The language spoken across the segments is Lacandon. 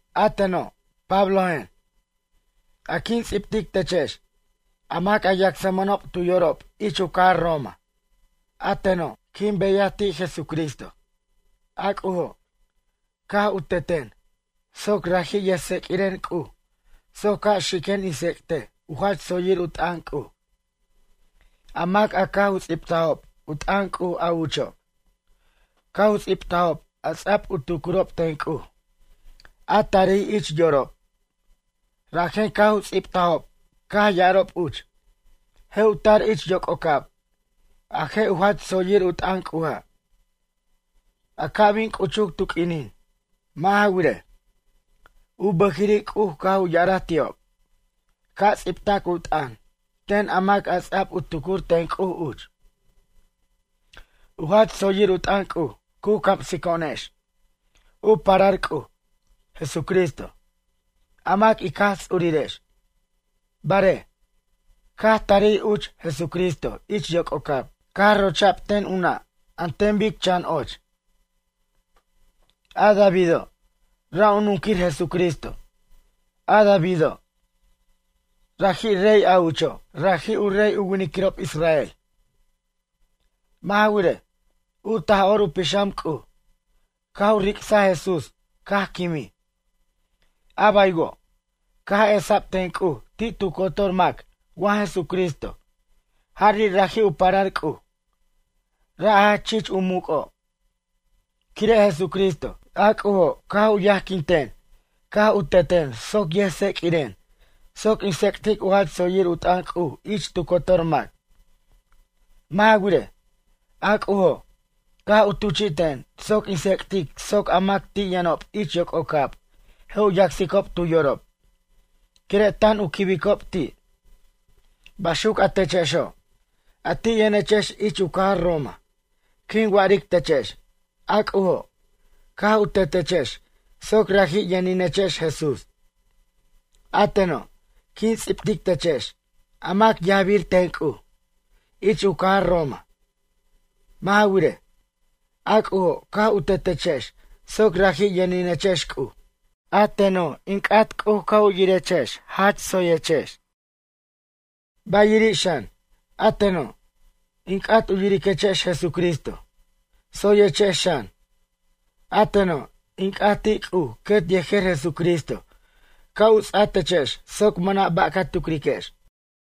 A teno' Pablojen, a quin ts'ibtic techex, a mac a yacsmʌnob tu yorob ich u cajar Roma. A teno', quin beyaj ti' Jesucristo. A C'ujo', caj u teten soc raji' yʌjtseq'uiren C'uj soc ca' xiquen in tsec'tej u jach tsoyir u t'ʌn C'uj. A mac a caj u ts'ibtajob u t'ʌn C'uj a ucho' caj u ts'ibtajob a ts'a'b u tucurob ten C'uj, a tarij ich yorob. Rajen caj u ts'ibtajob caj ya'arob uch: “Je' u tar ich yoc'ocab, a je' u jach tsoyir u t'ʌn C'uja', a ca' bin c'uchuc tu q'uinin.” Mʌ' ja wirej, u bʌjiri' C'uj caj u ya'araj ti'ob, ca' ts'ibtac u t'ʌn ten a mac a ts'ab u tucur ten C'uj uch. U jach tsoyir u t'ʌn C'uj cu camsico'onex u parar C'uj, Jesucristo, a mac ic Jaj Ts'urirex. Barej, caj tarij uch Jesucristo ich yoc'ocab, caj rocha'b ten u nʌ' an ten bic chan och. A Davido', ra' u nunquir Jesucristo. A Davido', raji' rey a ucho', raji' u rey u winiquirob israel. Mʌ' ja wirej, u Taj'or u Pixam C'uj, caj u ric'saj Jesús caj quimij. A baywo', caj esa'b ten C'uj ti' tu cotor mac wa Jesucristo jari' raji' u parar C'uj, ra' a jach chich u muc'o'. Quire' Jesucristo, a C'ujo' caj u yajquin ten caj u teten soc yʌjtseq'uiren soc in tsec'tic u jach tsoyir u t'ʌn C'uj ich tu cotor mac. Mʌ' ja wirej, a C'ujo', caj u tuchi'ten soc in tsec'tic soc a mac a ti' yʌnob ich yoc'ocab je' u yacsicob tu yorob, quire' tan u quibicob ti'. Baxuc a techexo', a ti' yʌnechex ich u cajar Roma, quin wa'aric techex, a C'ujo', caj u tetechex soc raji' yʌninechex Jesús. A teno', quin ts'ibtic techex, a mac yajbir ten C'uj, ich u cajar Roma. Mʌ' ja wirej, a C'ujo' caj u tetechex soc raji' yʌninechex C'uj. A teno', in c'at C'uj ca' u yirechex tsoyechex, ba'iri' xan, a teno', in c'at u yiriquechex Jesucristo tsoyechex xan. A teno', in c'at ti' C'uj quet yejer Jesucristo ca' u ts'a techex soc mʌna' ba' ca tucriquex.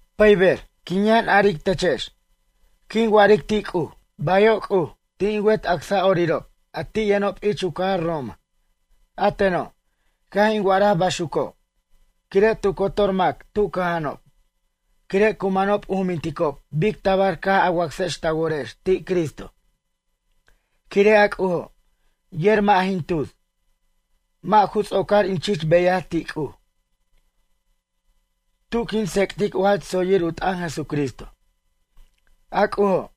Pʌyber, quin yʌn aric techex. Quin wa'aric ti' C'uj: “Bayo' C'uj ti' in wet acsa'orirob a ti' yʌnob ich u cajar Roma.” A teno', caj in wa'araj baxuco', quire' tu cotor mac tu cʌja'anob, quire' cu manob u juminticob bic tabar caj a wacsex ta worex ti' Cristo. Quire' a C'ujo', yer mʌ' jin tus, mʌ' ju ts'ocar in chich beyaj ti' C'uj, tu quin tsec'tic u jach tsoyir u t'ʌn Jesucristo. A C'ujo',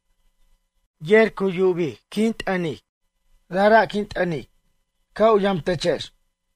yer yubic quin t'ʌnic, rajra' quin t'ʌnic, ca' u yamtechex.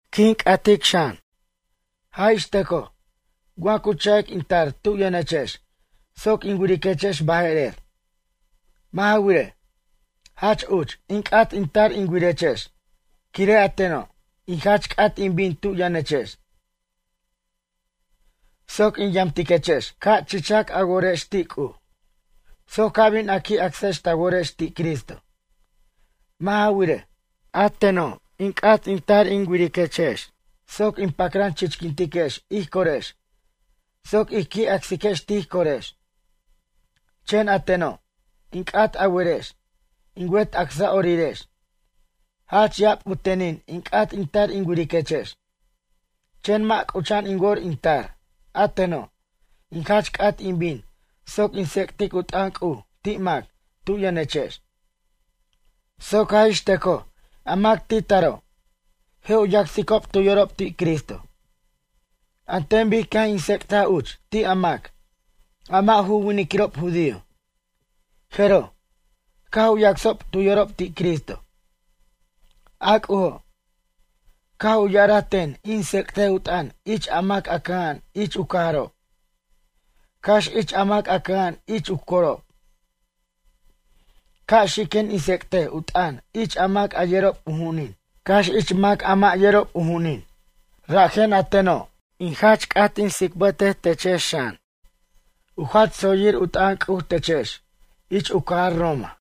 In c'atic xan, jaj ix tʌcoj, wa cu cha'ic in tar tu yʌnechex soc in wiriquechex baje'rer. Mʌ' ja wirej, jach uch, in c'at in tar in wirechex. Quire' a teno', in jach c'at in bin tu yʌnechex, soc in yamtiquechex, ca' chichac a worex ti' C'uj, soc ca bin a qui' acsex ta worex ti' Cristo. Mʌ' ja wirej, a teno' in c'at in tar in wiriquechex soc ic pacran chichquintiquex ij corex soc ij qui' acsiquex tij corex. Chen a teno', in c'at a werex, in wet acsa'orirex, jach ya'ab u tenin in c'at in tar in wiriquechex. Chen mʌ' c'ucha'an in wor in tar. A teno', in jach c'at in bin soc in tsec'tic u t'ʌn C'uj ti' mac tu yʌnechex, soc jaj ix tʌcoj a mac ti taro', je' u yacsicob tu yorob ti' Cristo, an ten bic caj in tsec'taj uch ti' a mac, a mʌ' ju winiquirob judío, jeroj, caj u yacsob tu yorob ti' Cristo. A C'ujo', caj u ya'araj ten in tsec'tej u t'ʌn ich a mac a cʌja'an ich u cajarob, cax ich a mac a cʌja'an ich u corob. Ca' xiquen in tsec'tej u t'ʌn ich a mac yerob u ju'unin, cax ich mac a mʌ' yerob u ju'unin. Rajen a teno', in jach c'at in tsicbʌtej techex xan, u jach tsoyir u t'ʌn C'uj techex ich u cajar Roma.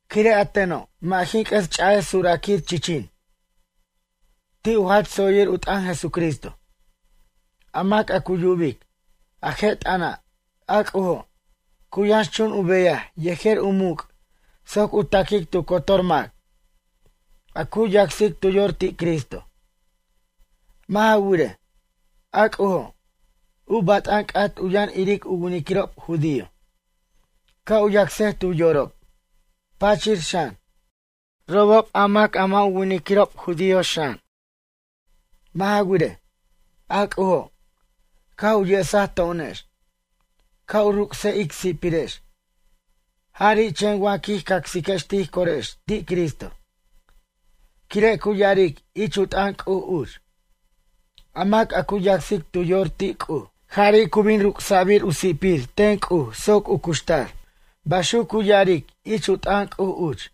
Quire' a teno', mʌ' jin c'ʌs ch'a'ej suraquir chichin, ti' u jach tsoyir u t'ʌn Jesucristo. A mac a cu yubic a je' t'ʌna', a C'ujo', cu yʌnxchun u beyaj yejer u muc' soc u taquic tu cotor mac, a cu yacsic tu yor ti' Cristo. Mʌ' ja wirej, a C'ujo', u bat'an c'at u yʌn iric u winiquirob judío, ca' u yacsej tu yorob, pachir xan, robob a mac a mʌ' ju winiquirob judío xan. Mʌ' ja wirej, a C'ujo', caj u yesaj to'onex, ca' u ruc'sej ic si'pirex, jari' chen wa quij cacsiquex tij corex ti' Cristo, quire' cu ya'aric ich u t'ʌn C'uj uch: “A mac a cu yacsic tu yor ti' C'uj, jari' cu bin ruc'sa'bir u si'pir ten C'uj soc u cuxtar.” Baxuc cu ya'aric ich u t'ʌn C'uj uch.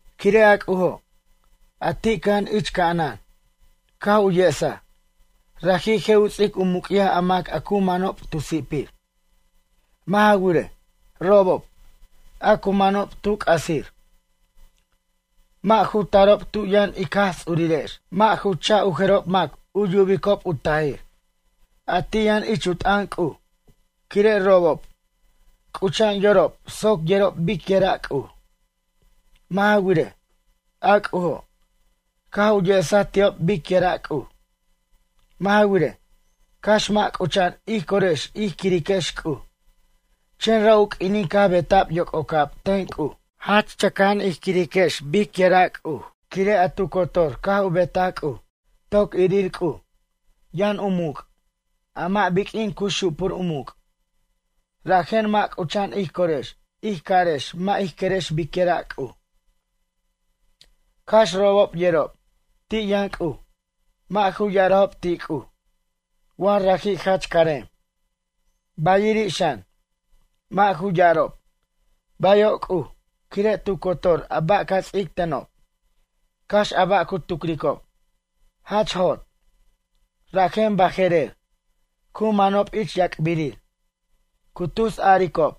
Quire' a C'ujo', a ti' cʌja'an ich ca'anan, caj u yesaj, raji' je' u ts'ic u muc'yaj a mac a cu manob tu sipir. Mʌ' ja wirej, robob, a cu manob tu c'asir, mʌ' ju tarob tu yʌn ic Jaj Ts'urirex, mʌ' ju cha' u jerob mac u yubicob u tajir, a ti' yʌn ich u t'ʌn C'uj. Quire' robob, c'ucha'an yorob soc yerob biquira' C'uj. Mʌ' ja wirej, a C'ujo', caj u yesaj ti'ob biquira' C'uj. Mʌ' ja wirej, cax mʌ' c'ucha'an ij corex ij quiriquex C'uj. Chen ra' u q'uinin caj beta'b yoc'ocab ten C'uj, jach chʌca'an ij quiriquex biquira' C'uj, quire' a tu cotor caj u betaj C'uj. Toc irir C'uj, yʌn u muc', a mʌ' biq'uin cu xupur u muc'. Rajen mʌ' c'ucha'an ij corex ij carex mʌ' ij querex biquira' C'uj. Cax robob yerob ti' yʌn C'uj, mʌ' ju ya'arajob ti' C'uj, wa raji' jach carem. Bayiri' xan, mʌ' ju ya'arob: “Bayo' C'uj quire' tu cotor a ba' ca ts'ic tenob.” Cax a ba' cu tucricob, jach jot, rajen baje'rer, cu manob ich yac'birir. Cu tus aricob: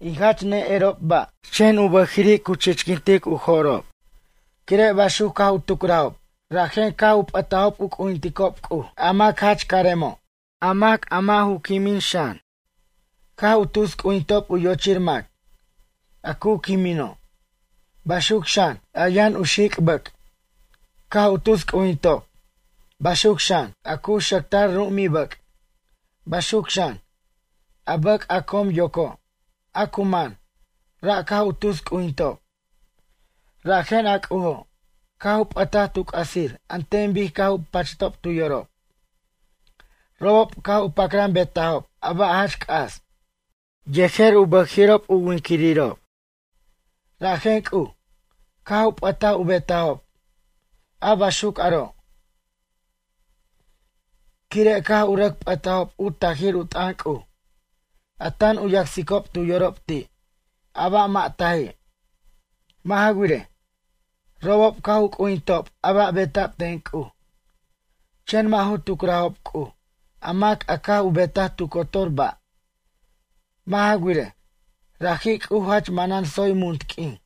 “In jach ne'erob ba'.” Chen u bʌjiri' chichquint u jo'rob. Quire' baxuc caj u tucrajob, rajen caj p'ʌtajob u c'ujinticob C'uj, a mac jach caremo', a mac a mʌ' ju quimin xan. Caj u tus c'ujinticob u yochir mac, a cu quimino'. Baxuc xan, a yʌn u xic' bʌc', caj u tus c'ujintob, baxuc xan, a cu xʌctar ru'umibʌc', baxuc xan, a bʌc' a com yoco' a cu man, ra' caj u tus c'ujintob. Rajen a C'ujo', caj u p'ʌtaj tu c'asir an ten bic caj u pachtob tu yorob. Robob caj u pacran betajob a ba' jach c'as, yejer u bʌjiri'ob u winquirirob. Rajen C'uj, caj u p'ʌtaj u betajob a baxuc aro' quire' caj u rʌc p'ʌtajob u tajir u t'ʌn C'uj, a tan u yacsicob tu yorob ti' a ba' mʌ' taji'. Mʌ' ja wirej, robob caj u c'ujintob a ba' beta'b ten C'uj, chen mʌ' ju tucrajob C'uj a mac a caj u betaj tu cotor ba'. Mʌ' ja wirej, raji' C'uj jach manan tsoy munt q'uin.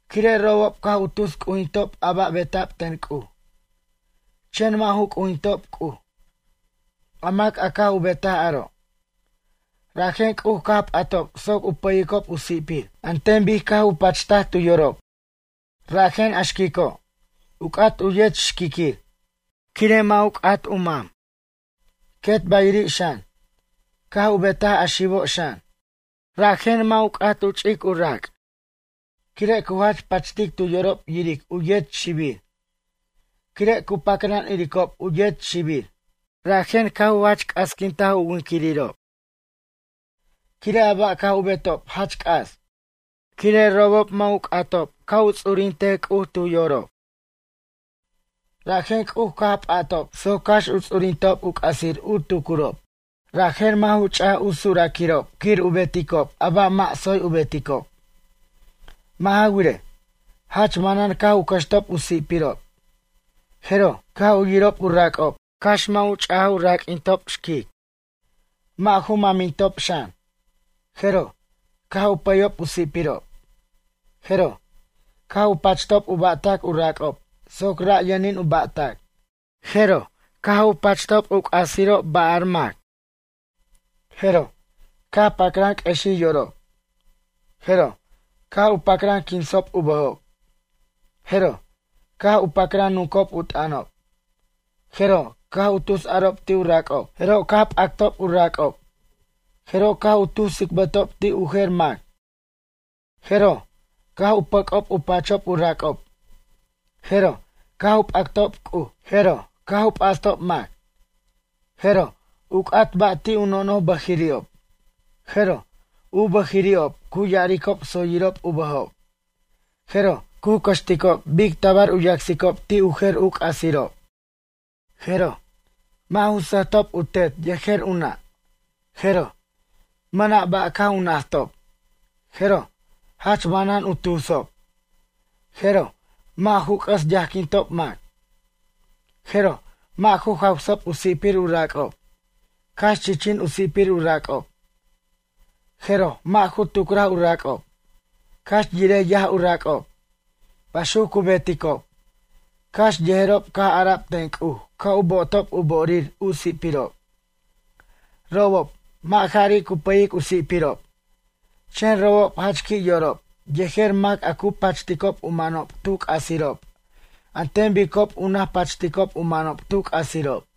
Quire' robob caj u tus c'ujintob a ba' beta'b ten C'uj, chen mʌ' ju c'ujintob C'uj, a mac a caj u betaj aro', rajen C'uj caj p'atob soc u pʌyicob u si'pir an ten bic caj u pachtaj tu yorob. Rajen a xquico', u c'at u yet xquiquir, quire' mʌ' ju c'at u mam. Quet bayiri' xan, caj u betaj a xibo' xan. Raji' mʌ' ju c'at u ch'ic u rac', quire' cu jach pachtic tu yorob yiric u yet xibir. Quire' cu pacran iricob u yet xibir, rajen caj u jach c'asquintaj u winquirirob, quire' a ba' caj u betob jach c'as. Quire' robob mʌ' ju c'atob, ca' u ts'urintej C'uj tu yorob, rajen C'uj caj p'atob soc cax u ts'urintob u c'asir u tucurob, rajen mʌ' ju ch'aj u suraquirob quir u beticob a ba' mʌ' tsoy u beticob. Mʌ' ja wirej, jach manan caj u cʌxtob u si'pirob. Jeroj, caj u yirob u rac'ob cax mʌ' ju ch'aj u raq'uintob xquic, mʌ' ju mʌmintob xan. Jeroj, caj u pʌyob u si'pirob, jeroj, caj u pachtob u ba'tac u rac'ob soc ra' yʌnin u ba'tac. Jeroj, caj u pachtob u c'asirob bar mac. Jeroj, pacran q'uexij yorob. Jeroj, caj u pacran quinsob u bʌjob. Jeroj, caj u pacran nuncob u t'ʌnob. Jeroj, caj u tus arob ti' u rac'ob. Jeroj, caj p'actob u rac'ob. Jeroj, caj u tus tsicbʌtob ti' u jer mac. Jeroj, caj u pʌc'ob u pachob u rac'ob. Jeroj, caj u p'actob C'uj. Jeroj, caj u p'astob mac. Jeroj, u c'at ba' ti' u nonoj bʌjiri'ob. Jeroj, u bʌjiri'ob cu ya'aricob tsoyirob u bʌjob. Jeroj, cu cʌxticob bic tabar u yacsicob ti' u jer u c'asirob. Jeroj, mʌ' ju sʌjtob u tet yejer u nʌ'. Jeroj, mʌna' ba' caj u najtob. Jeroj, jach manan u tusob. Jeroj, mʌ' ju c'ʌs yajquintob mac. Jeroj, mʌ' ju jawsob u si'pir u rac'ob, cax chichin u sipir u racob. Jeroj, mʌ' ju tucraj u rac'ob, cax yirej yaj u rac'ob. Baxuc cu beticob, cax yerob caj ara'b ten C'uj ca' u bo'otob u bo'orir u si'pirob. Robob, mʌ' jari' cu pʌyic u si'pirob, chen robob jach qui' yorob yejer mac a cu pachticob u manob tu c'asirob an ten bicob u naj pachticob u manob tu c'asirob.